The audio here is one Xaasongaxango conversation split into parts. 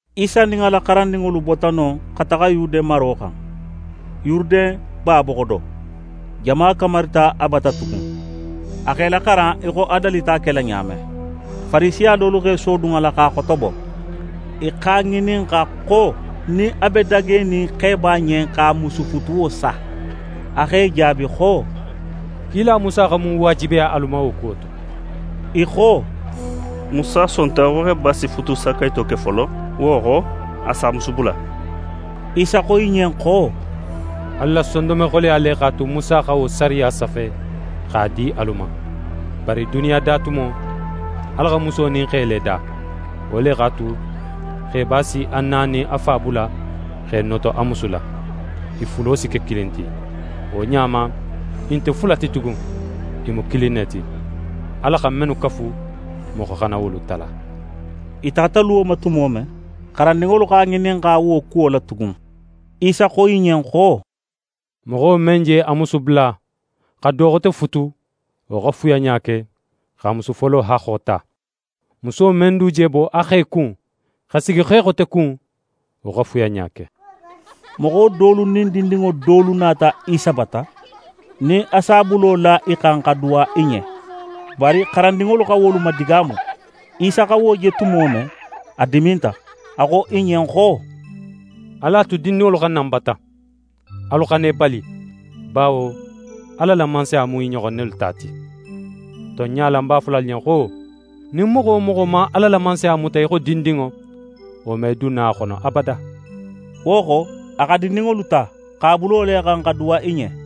Isa nin a la xarandinŋolu bota non xa taxa Yude maro xan, Yuruden ba boxo do. Jama kamarita a bata tugun; a x'e laxaran í xo a dalita a kela ɲa men. Farisiya dolu x'e sodun a la x'a xotobo. I x'a ŋininxa xo nin a be dagenin xeba ɲen, x'a musu futuwo sa. A x'e jaabi xo: «Kila Musa xa mun waajibiya alu ma wo kuwo to?» I xo: «Musa sonta xo xeba si futusakayito ke folo, wo xo, a si a musu bula.» Isa xo i ɲen xo: «Alu la sondonme xoleya le x'a tu Musa xa wo sariya safe x'a di alu ma. Bari duniya datumo, Ala xa muso nin xe le da. Wo le x'a tu, xeba si a na nin a fa bula, x'é noto a musu la. I fulo si ke kilin ti. Wo ɲa ma, i nte fula ti tugun, i mu kilin ne ti. Ala xa mennu kafu, moxo xana wolu tala.» I taxata luwo ma tumo men, xarandinŋolu x'a ŋininxa wo kuwo la tugun. Isa xo i ɲen xo: «Moxo men je a musu bula, xa do xote futu, wo xa fuyanɲa ke, x'a musu folo haxxo ta. Muso men du je bo a xe kun, xa sigi xe xote kun, wo xa fuyanɲa ke.» Moxo dolu nin dindinŋo dolu nata Isa bata nin a si a bulo la i xan, xa duwa i ɲen. Bari xarandinŋolu xa wolu madigaamu. Isa xa wo je tumo men, a diminta. A xo i ɲen xo: «Alu a tu dindinŋolu xa na ń bata! Alu xana i bali, bawo Ala la Mansaya mu i ɲoxon nelu ta ti. Tonɲa la, ń b'a fola alu ɲen xo: Nin moxo wo moxo man Ala la Mansaya muta í xo dindinŋo, wo me dun no a xono abada.» Wo xo, a xa dindinŋolu ta, x'a bulo la i xan, xa duwa i ɲen.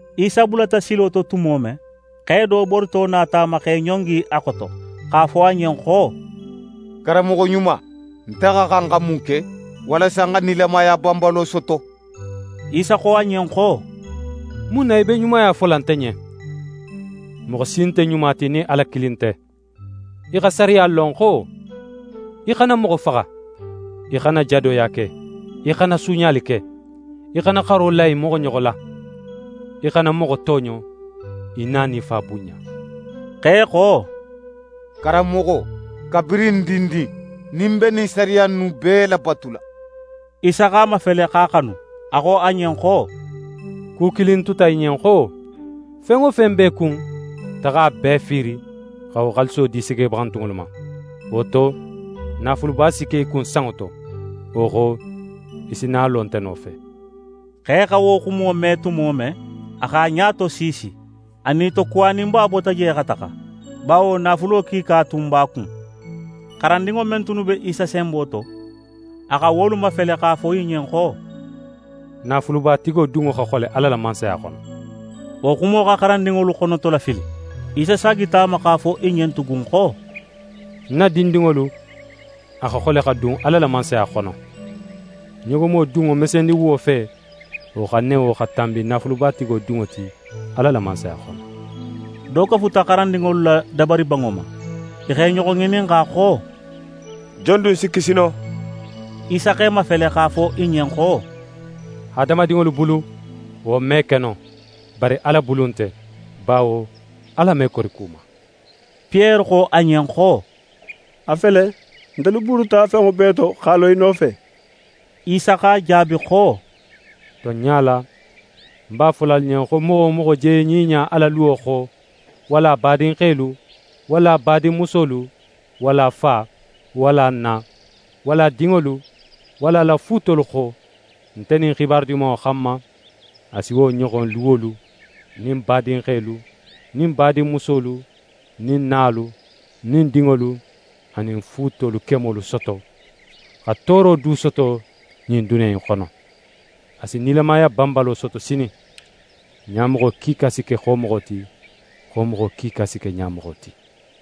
Isa bulata silo to tumo men, xe do borito nata a ma, x'é ɲongi a xoto, x'a fo a ɲen xo: «Karanmoxo ɲuma, nte xa xan xa mun ke walasa ń xa nilamaya banbalo soto?» Isa xo a ɲen xo: «Mun na í be ɲumaya fola nte ɲen? Moxo si nte ɲuma ti nin Ala kilin nte. Í xa sariyalu lon xo: “Í xana moxo faxa, í xana jadoya ke, í xana suuɲali ke, í xana xaro la í moxoɲoxo la, í xana moxo tooɲo, í na nin í fa bunɲa.”» Xe xo: «Karanmoxo, kabirin ń dindin, nin ń be ɲin sariya innu bee labatula.» Isa x'a mafele, x'a xanu. A xo a ɲen xo: «Ku kilin tuta í ɲen xo. Fen wo fen be í kun, taxa a bee fiiri, xa wo xaaliso di segebaxantunŋolu ma. Wo to, naafuluba si ke í kun sanŋo to. Wo xo, í si na a lo nte nofe.» Xe xa wo xumo me tumo men, a x'a ɲa tosiisi. A nitokuwaninba bota je xa taxa, bawo naafulo kiika tun b'a kun. xarandinŋo men tunnu be Isa senbo to, a xa wolu mafele, x'a fo i ɲen xo: «Naafulubatigo dunŋo xa xole Ala la Mansaya xono!» Wo xumo xa xarandinŋolu xonotolafili. Isa saagita a ma, x'a fo i ɲen tugun xo: «Ń na dindinŋolu, a xa xole xa dun Ala la Mansaya xono! Ɲogomo dunŋo mesendiwuwo fe, wo xa newo xa tanbi naafulubatigo dunŋo ti Ala la Mansaya xono.» Do kafuta xarandinŋolu la dabaribanŋo ma. I x'e ɲoxo ŋininxa xo: «Jon dun si kisi no?» Isa x'e mafele x'a fo i ɲen xo: «Hadamadinŋolu bulu, wo me ke no, bari Ala bulu nte, bawo Ala me kori ku ma.» Piyere xo a ɲen xo: «A fele, ntelu buruta fenŋo bee to, x'a lo í nofe.» Isa x'a jaabi xo: «Tonɲa la, ń b'a fola alu ɲen xo moxo wo moxo je ɲiɲa a la luwo xo, walla a badinxelu, walla a badinmusolu, walla a fa, walla a na, walla a dinŋolu, walla a la fuutolu xo, nte nin Xibaru Dimanŋo xanma, a si wo ɲoxon luwolu, nin badinxelu nin badinmusolu, nin nalu, nin dinŋolu, anin fuutolu kemolu soto, xa tooro du soto ɲin duniya in xono. A si nilamaya banbalo soto sinin. Ɲamoxo kiika si ke xomoxo ti, xomoxo kiika si ke ɲamoxo ti.»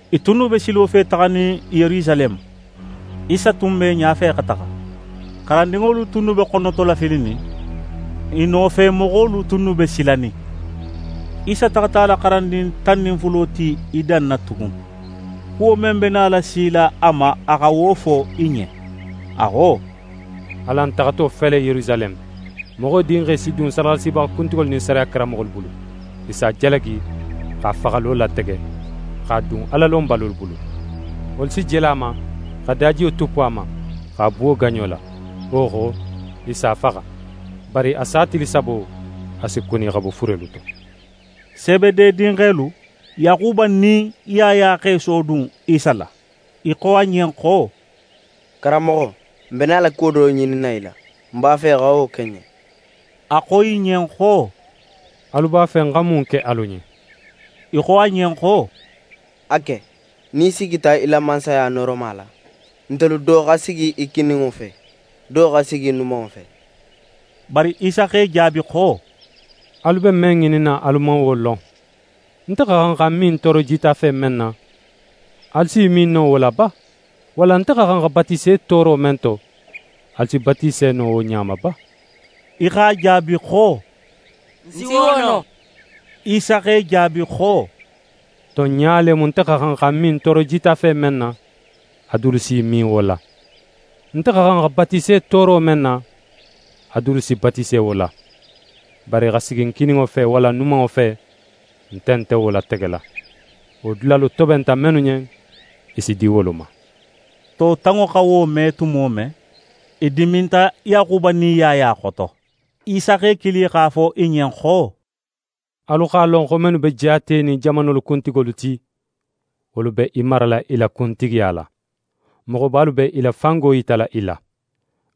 I tunnu be silo fe taxanin Yerusaleme. Isa tun be i ɲafe xa taxa. xarandinŋolu tunnu be xonotolafilinin; i nofemoxolu tunnu be silanin. Isa taxata a la xarandin tan nin fulo ti i danna tugun. Kuwo men be nala sila a ma, a xa wo fo i ɲen. A xo: «Alan taxato fele Yerusaleme, Moxo Dinxe si dun sadaxalasibaxa kuntigolu nin sariya karanmoxolu bulu. I s'a jalagi, x'a faxalo latege, x'a dun Alalonbalolu bulu. Wolu si jele a ma, xa dajiyo tuppu a ma, x'a buwo gaɲo la. Wo xo, i s'a faxa. Bari a sa tili sabo, a si kuni xa bo furelu to.» Sebede dinxelu, Yaxuba nin Yaya x'e sodun Isa la. I xo a ɲen xo: «Karanmoxo, n be nala kuwo do ŋininna í la, n b'a fe í xa wo ke n ɲen.» A xo i ɲen xo: «Alu b'a fe ń xa mun ke alu ɲen?» I xo a ɲen xo: «A ke, nin í sigita í la Mansaya nooroma la, ntelu do xa sigi í kininŋo fe, do xa sigi í numanŋo fe.» Bari Isa x'e jaabi xo: «Alu be men ŋininna, alu man wo lon. Nte xa xan xa ń min tooro jitafe men na, alu s'i min no wo la ba? Walla nte xa xan xa batise tooro men to, alu si batise no wo ɲa ma ba?» I x'a jaabi xo: «N si wo no.» Isa x'e jaabi xo: «Tonɲa le mu, nte xa xan xa ń min tooro jitafe men na, a dulu s'i min wo la. Nte xa xan xa batise tooro men na, a dulu si batise wo la. Bari xa sigi ń kininŋo fe walla ń numanŋo fe, nte nte wo lategela. Wo dulalu tobenta mennu ɲen, i si di wolu ma.» To tanŋo xa wo me tumo men, i diminta Yaxuba nin Yaya xoto. Isa x'e kili x'a fo i ɲen xo: «Alu x'a lon xo mennu be jaatenin jamanolu kuntigolu ti, wolu be i marala i la kuntigiya la, moxobalu be i la fango yitala i la.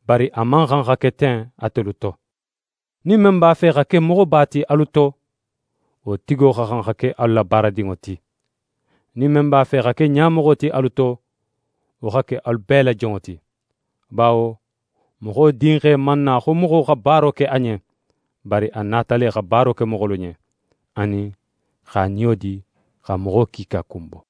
Bari a man xan xa ke ten atelu to. Nin men b'a fe xa ke moxoba ti alu to, wo tigo xa xan xa ke alu la baaradinŋo ti. Nin men b'a fe xa ke ɲamoxo ti alu to, wo xa ke alu bee la jonŋo ti. Bawo Moxo Dinxe man na xo moxo xa baara ke a ɲen; bari a nata le xa baaro ke moxolu ɲen, anin x'a niyo di xa moxo kiika kunbo.»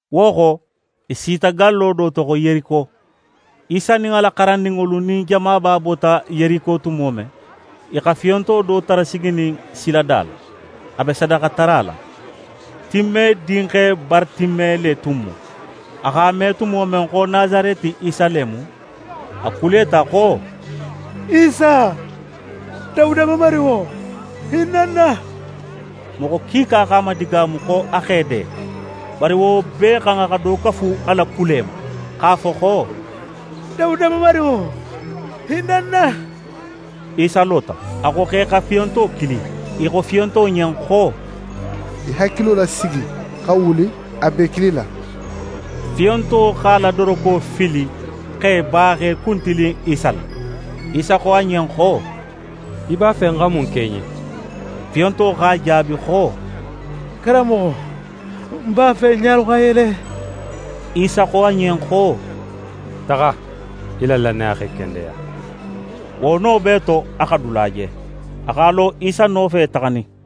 Wo xo, i sita gallo do to xo Yeriko. Isa nin a la xarandinŋolu nin jamaba bota Yeriko tumo men, i xa fiyonto do tara siginin silada la, a be sadaxatara la. Time dinxe Baratime le tun mu. A x'a me tumo men xo Nasareti Isa le mu, a kuleta xo: «Isa, Dawuda Mamarinŋo, hinna ń na!» Moxo kiika x'a madigaamu, xo a x'é de. Bari wo bee xan, a xa do kafu kule ma, x'a fo xo: «Dawuda Mamarinŋo, hinna ń na!» Isa lota; a xo x'e xa fiyonto kili. I xo fiyonto ɲen xo: «Í hakilo lasigi, xa wuli, a b'é kilila.» Fiyonto x'a la doroko fili, x'é ba x'é kuntilin Isa la. Isa xo a ɲen xo: «Í b'a fe ń xa mun ke í ɲen?» Fiyonto x'a jaabi xo: «Karanmoxo, ń b'a fe ń ɲalu xa yele!» Isa xo a ɲen xo: «Taxa; í la lannaya x'é kendeya.» Wo no bee to, a xa dula je, a x'a lo Isa nofe taxanin.